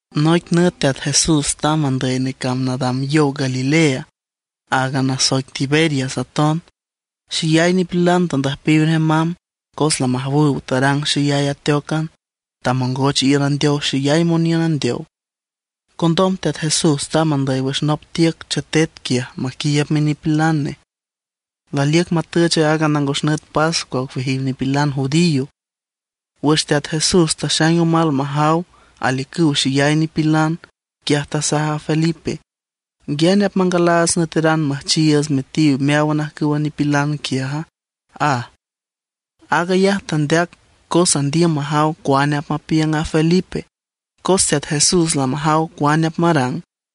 Noic nüt Teat Jesús tamb andüy necamb nadam yow Galilea, aaga nasoic Tiberias aton. Xeyay nipilan tandüjpiw nej mamb cos lamajawüw tarang xeyay ateócan, tamongoch iün andeow xeyay moniün andeow. Condom Teat Jesús tamb andüy wüx nop tiüc chetet quiaj maquiiüb minipilan nej. Laliüc matüch aaga nangos nüt pascua ocueajiw nipilan judío. Wüx Teat Jesús taxaing omal majaw aliücüw xeyay nipilan, quiaj tasaj a Felipe: ―¿Nguiane apmangalaats nüeteran müjchiiüts metiw meáwan ajcüwa nipilan quiaja? ―aj. Aag ayaj tandeac cos andiüm majaw cuane apmapiüng a Felipe, cos Teat Jesús lamajaw cuane apmarang.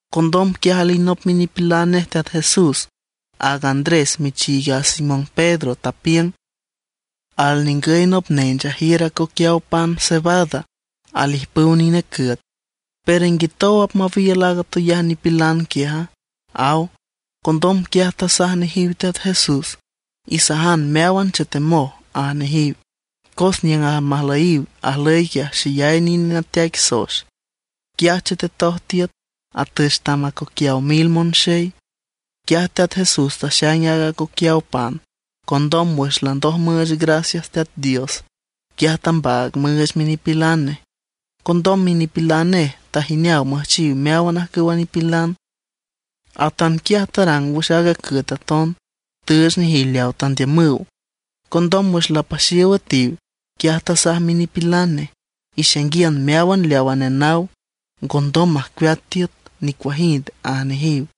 Condom quiaj alinop minipilan nej Teat Jesús, aaga Andrés michiig a Simón Pedro, tapiüng: ―Alningüy nop nench ajiür acoquiaw pan cebada alijpüw nine cüet. Pero ¿nguitow apmawiül aaga atoyay nipilan quiaja? ―aw. Condom quiaj tasaj nejiw Teat Jesús: ―Isajan meáwan chetemoj ―aj nejiw. Cos niüng almajlüyiw ajlüy xeyay nine nateaic soex, quiaj chetetoj tiüt, atüch tam acoquiaw mil monxey. Quiaj Teat Jesús taxaing aaga acoquiaw pan; condom wüx landoj müüch gracias Teat Dios, quiaj tambaag müüch minipilan nej. Condom minipilan nej tajineaw müjchiw meáwan ajcüwa nipilan. Atanquiaj tarang wüx aaga cüet aton, tüüch nejiw leaw tandiümüw. Condom wüx lapaxiow üetiw, quiaj tasaj minipilan nej: ―Ixainguiün meáwan leawa nenaw, ngondom majcueat tiüt nicuajind ―aj nejiw.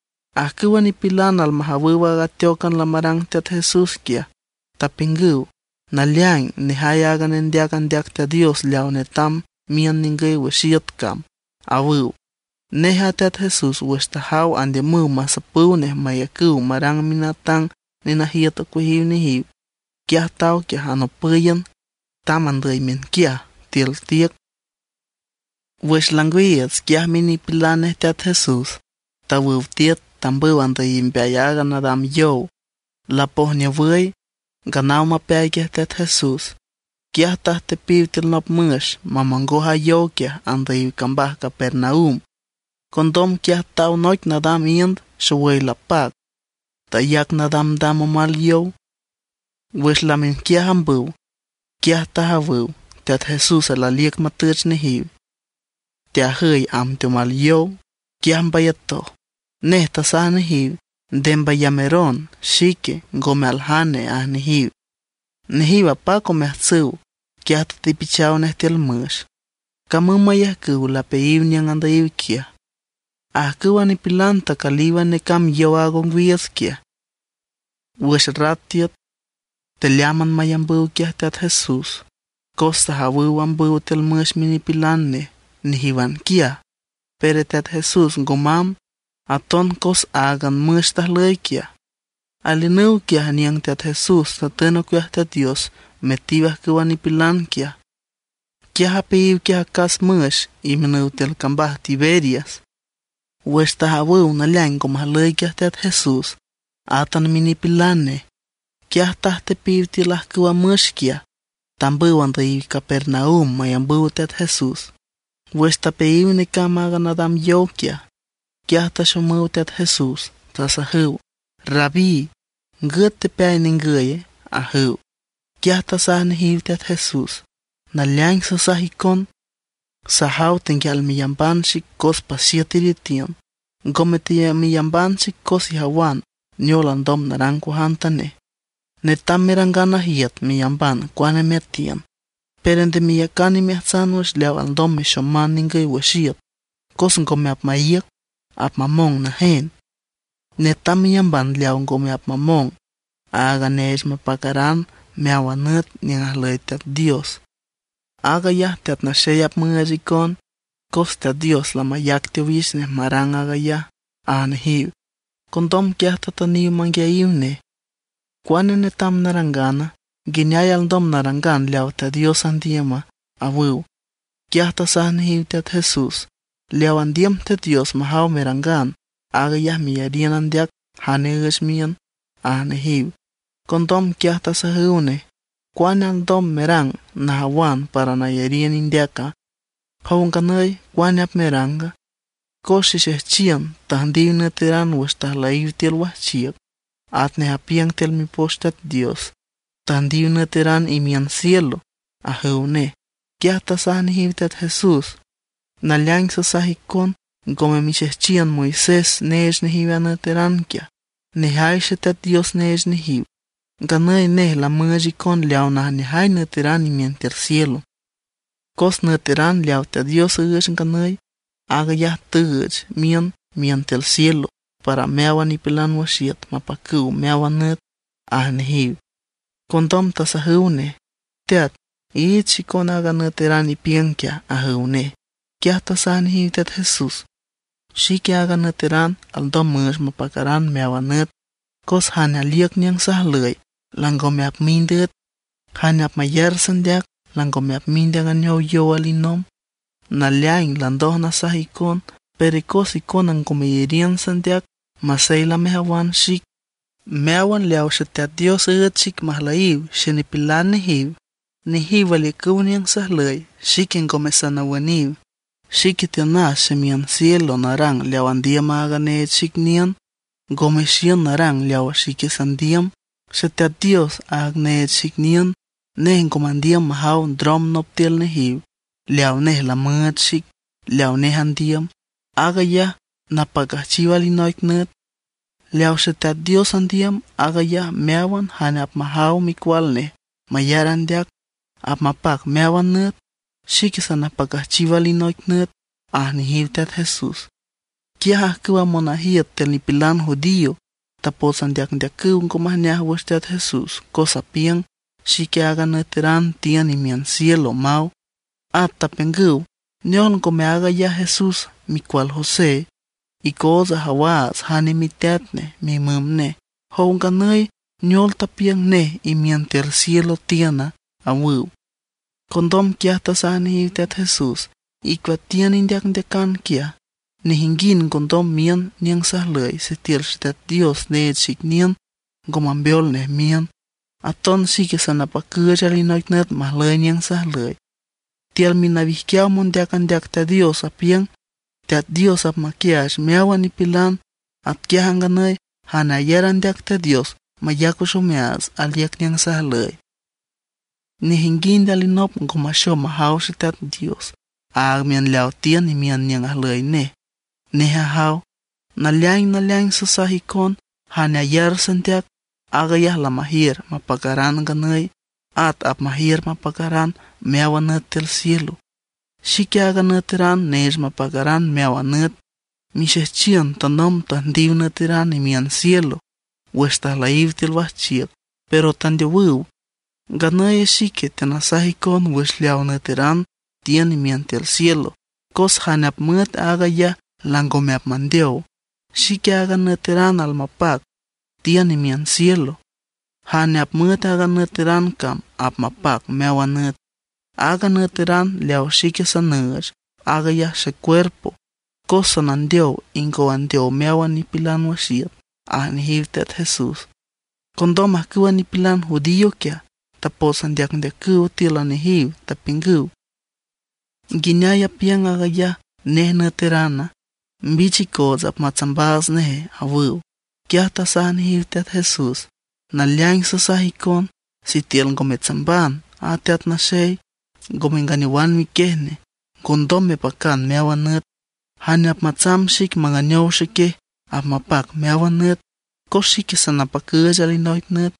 Ajcüwa nipilan almajawüw aaga ateócan lamarang Teat Jesús quiaj, tapiüngüw: ―Naleaing, nejay aaga nendeac andeac Teat Dios leaw netam miün ningüy wüx iüt cam ―awüw. Nej a Teat Jesús wüx tajaw andiümüw masapüw nej mayacüw marang minatang nenajiüt ocueajiw nejiw, quiaj taw quiaj anopǘyan. Tamb andüy miünquiaj tiül tiüc. Wüx langwiiüts, quiaj minipilan nej Teat Jesús tawüw tiüt tambüw andüyiw mbeay aaga nadam yow. Lapojniowüy, nganaw mapeay quiaj Teat Jesús, quiaj tajtepiw tiül nop müx mamongoj a yow quiaj andüyiw cambaj Capernaum. Condom quiaj taw noic nadam iünd xowüy lapac, tayac nadamdam omal yow. Wüx lamiünquiaj ambüw, quiaj tajawüw Teat Jesús laliüc matüch nejiw, teajüy amb teomal yow. Quiaj mbayatoj. Nej tasaj nejiw: ―Nde mbayameron, xique, ngome aljane ―aj nejiw. Nejiw apac omeajtsüw, quiaj tatepichaw nej tiül müx, camüm mayajcüw lapeayiw niüng andüyiw quiaj. Ajcüwa nipilan tacülíwan necamb yow aaga ongwiiüts quiaj. Wüx rat tiüt tealeámban mayambüw quiaj Teat Jesús; cos tajawüw ambüw tiül müx minipilan nej nejíwan quiaj, pero Teat Jesús ngo mamb; aton cos áagan a müx tajlüy quiaj. Aliünüw quiaj niüng Teat Jesús tatün ocueaj Teat Dios metiw ajcüwa nipilan quiaj; quiaj apeayiw quiaj acas müx imiünüw tiül cambaj Tiberias. Wüx tajawüw naleaing ngo majlüy quiaj Teat Jesús átan minipilan nej, quiaj tajtepiw tiül ajcüwa müx quiaj, tambüw andüyiw Capernaum mayambüw Teat Jesús. Wüx tapeayiw necamb aaga nadam yow quiaj, quiaj taxomüw Teat Jesús, tasajüw: ―Rabí ¿ngüt tepeay ningüye? ―ajüw. Quiaj tasaj nejiw Teat Jesús: ―Naleaing sasaj icon, sajaw tenguial meyamban xic cos paxiüt iretiün, ngome teameyamban xic cos ijawan neol alndom narang cuajantanej. Netam merangan najiüt meyamban cuane meatiün. Pero nde meyacan imeajtsan wüx leaw alndom mexoman ningüy wüx iüt cos ngome apmaíüc, apmamong najen. Netam meyamban leawa ngome apmamong: aaga neech mapacaran meáwan nüt niüng ajlüy Teat Dios. Aag ayaj Teat Naxey apmüüch icon, cos Teat Dios lamayac teowix nej marang aag ayaj ―aj nejiw. Condom quiaj tatüniw manguiayiw nej: ―¿Cuane netam narangana? ¿Nguineay alndom narangan leaw Teat Dios andiüma? ―awüw. Quiaj tasaj nejiw Teat Jesús: ―Leaw andiüm Teat Dios majaw merangan, aag ayaj meyariün andeac jane üüch miün ―aj nejiw. Condom quiaj tasajüw nej: ―¿Cuane alndom merang najawan para nayariün indeaca? Jow nganüy, ¿cuane apmeranga? Cos xexejchiün tüjndiw nüeteran wüx tajlüyiw tiül wajchiüc, atnej apiüng tiül Mipoch Teat Dios: “Tüjndiw nüeteran imiün cielo” ―ajüw nej. Quiaj tasaj nejiw Teat Jesús: ―Naleaing sasaj icon, ngome mixejchiün Moisés neech nejiw a nüeteran quiaj; nejay Xeteat Dios neech nejiw. Nganüy nej lamüüch icon leaw najneajay nüeteran imiün tiül cielo. Cos nüeteran leawa Teat Dios üüch nganüy, aag ayaj tüüch miün imiün tiül cielo, para meáwan nipilan wüx iüt mapacüw meáwan nüt ―aj nejiw. Condom tasajüw nej: ―Teat, iich xicon aaga nüeteran ipiüng quiaj ―ajüw nej. Quiaj tasaj nejiw Teat Jesús: ―Xique aaga nüeteran alndom müüch mapacaran meáwan nüt. Cos jane aliüc niüng sajlüy langome apmind üet; jane apmayar sandeac langome apmind anganeow yow alinomb. Naleaing landoj nasaj icon, pero cos icona ngo meyariün sandeac masey lamejawan xic. Meáwan leaw Xeteat Dios üüch xic majlüy xenipilan nejiw, nejiw aliücüw niüng sajlüy, xique ngome sanawüniw. Xique tiünas ximiün cielo narang leaw andiüm aaga neech xic niün, ngome xiün narang leaw xique sandiüm. Xeteat Dios, aag neech xic niün, nej ngo mandiüm majaw ndrom nop tiül nejiw leaw nej lamüüch xic; leawa nej andiüm, aag ayaj napacüjchiw alinoic nüt. Leaw Xeteat Dios andiüm, aag ayaj meáwan jane apmajaw Micual nej mayar andeac, apmapac meáwan nüt; xique sanapacüjchiw alinoic nüt ―aj nejiw Teat Jesús. Quiaj ajcüwa monajiüt tiül nipilan judío tapots andeacndeacüw ngo majneaj wüx Teat Jesús cos apiüng: “Xique aaga nüeteran tiün imiün cielo”, maw. At tapiüngüw: ―¿Neol, ngome aag ayaj Jesús micual José? Icoots ajawaats jane miteat nej mimüm nej. Jow nganüy, ¿neol tapiüng nej imiün tiül cielo tiüna? ―awüw. Condom quiaj tasaj nejiw Teat Jesús: ―Icueatiün indeacndeacan quiaj. Nejinguind ngondom miün niüng sajlüy sitiül Xeteat Dios neech xic niün ngo mambeol nej miün. Aton xique sanapacüüch alinoic nüt majlüy niüng sajlüy. Tiül minawijquiaw mondeac andeac Teat Dios apiüng: “Teat Dios apmaquiaach meáwan nipilan.” Atquiaj a nganüy jane ayar andeac Teat Dios mayac wüx omeaats aliüc niüng sajlüy. ’Nejinguind alinop ngo maxom majaw Xeteat Dios, aag miün leaw tiün imiün niüng ajlüy nej, nej ajaw. Naleaing naleaing sasaj icon, jane ayar sandeac aag ayaj lamajiür mapacaran nganüy, at apmajiür mapacaran meáwan nüt tiül cielo. Xique aaga nüeteran neech mapacaran meáwan nüt. Mixejchiün tanomb tüjndiw nüeteran imiün cielo wüx tajlüyiw tiül wajchiüc, pero tandeowüw. Nganüy xique teanasaj icon wüx leaw nüeteran tiün imiün tiül cielo, cos jane apmüet aag ayaj langome apmandeow. Xique aaga nüeteran almapac, tiün imiün cielo. Jane apmüet aaga nüeteran cam apmapac meáwan nüt. Aaga nüeteran leaw xique sanüüch, aag ayaj xecuerpo. Cos sanandeow ingow andeow meáwan nipilan wüx iüt ―aj nejiw Teat Jesús. Condom ajcüwa nipilan judío quiaj, tapots andeacndeacüw tíülan nejiw, tapiüngüw: ―¿Nguineay apiüng aag ayaj nej nüeterana? ¡Mbich icoots apmatsambaats nej! ―awüw. Quiaj tasaj nejiw Teat Jesús: ―Naleaing sasaj icon, sitiül ngo metsamban a Teat Naxey, ngo menganeowan miquiej nej, ngondom mepacan meáwan nüt. Jane apmatsamb xic manganeow xequiej apmapac meáwan nüt; cos xique sanapacüüch alinoic nüt.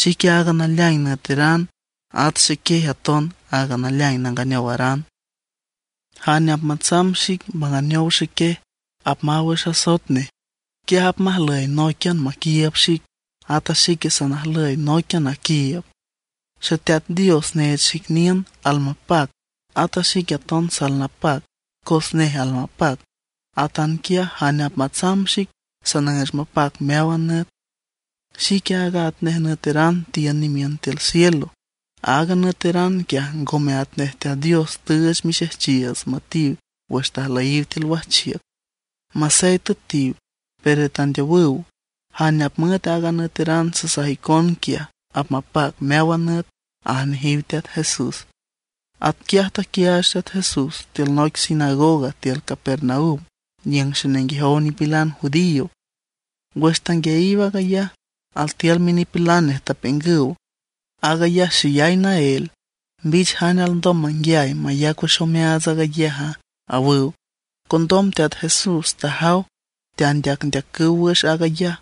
Xique aaga naleaing nüeteran, at xequiej aton aaga naleaing nanganeowaran. Jane apmatsamb xic manganeow xequiej apmaw wüx asoet nej; quiaj apmajlüy nóiquian maquiiüb xic, ata xique sanajlüy nóiquian naquiiüb. Xeteat Dios neech xic niün almapac, ata xique aton salnapac cos nej almapac. Atanquiaj jane apmatsamb xic sanüüch mapac meáwan nüt. Xique aaga atnej nüeteran tiün imiün tiül cielo. Aaga nüeteran quiaj ngome atnej Teat Dios tüüch mixejchiiüts müetiw wüx tajlüyiw tiül wajchiüc. Masey tüetiw, pero tandeowüw. Jane apmüet aaga nüeteran sasaj icon quiaj, apmapac meáwan nüt ―aj nejiw Teat Jesús. Atquiaj taquiaach Teat Jesús tiül noic sinagoga tiül Capernaum niüng xenenguejow nipilan judío. Wüx tanguiayiw aag ayaj, altiül minipilan nej tapiüngüw: ―Aag ayaj xeyay naél. ¿Mbich jane alndom manguiay mayac wüx omeaats aag ayaja? ―awüw. Condom Teat Jesús wüx tajaw teandeacndeacüw wüx aag ayaj,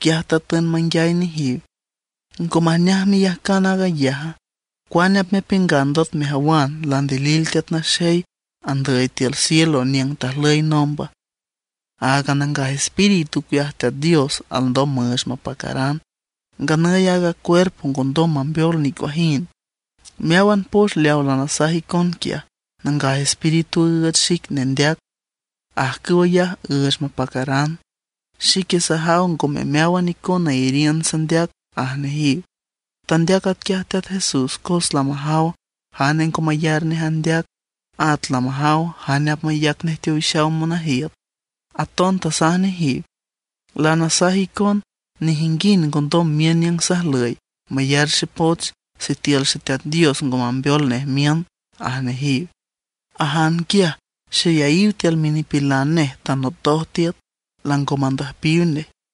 quiaj tatün manguiay nejiw: ―¿Ngo majneaj meyajcan aag ayaja? ¿Cuane apmepiüngan ndot mejawan landilil Teat Naxey andüy tiül cielo niüng tajlüy nomba? Áagan Nangaj Espíritu ocueaj Teat Dios alndom müüch mapacaran; nganüy aaga cuerpo ngondom mambeol nicuajind. Meáwan poch leaw lanasaj icon quiaj Nangaj Espíritu üüch xic nendeac, ajcüw ayaj üüch mapacaran. Xique sajaw ngome meáwan icona iyariün sandeac ―aj nejiw. Tandeac atquiaj Teat Jesús cos lamajaw jane ngo mayar nej andeac, at lamajaw jane apmayac nej teowix monajiüt. Aton tasaj nejiw: ―Lanasaj icon, nejinguind ngondom miün niüng sajlüy mayar xepoch sitiül Xeteat Dios ngo mambeol nej miün ―aj nejiw. Ajan quiaj xeyayiw tiül minipilan nej tanotoj tiüt, lango mandüjpiw nej.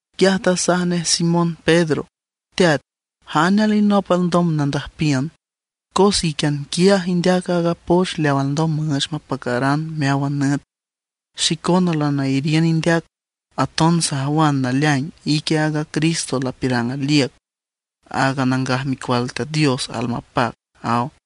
Quiaj tasaj nej Simón Pedro: ―Teat ¿jane alinop alndom nandüjpiün? Cos íquian quiaj indeac a poch leaw alndom müüch mapacaran meáwan nüt. Xicona lanayariün indeac, aton sajawan naleaing ique a Cristo lapiürang aliüc, aaga Nangaj Micual Teat Dios almapac ―aw.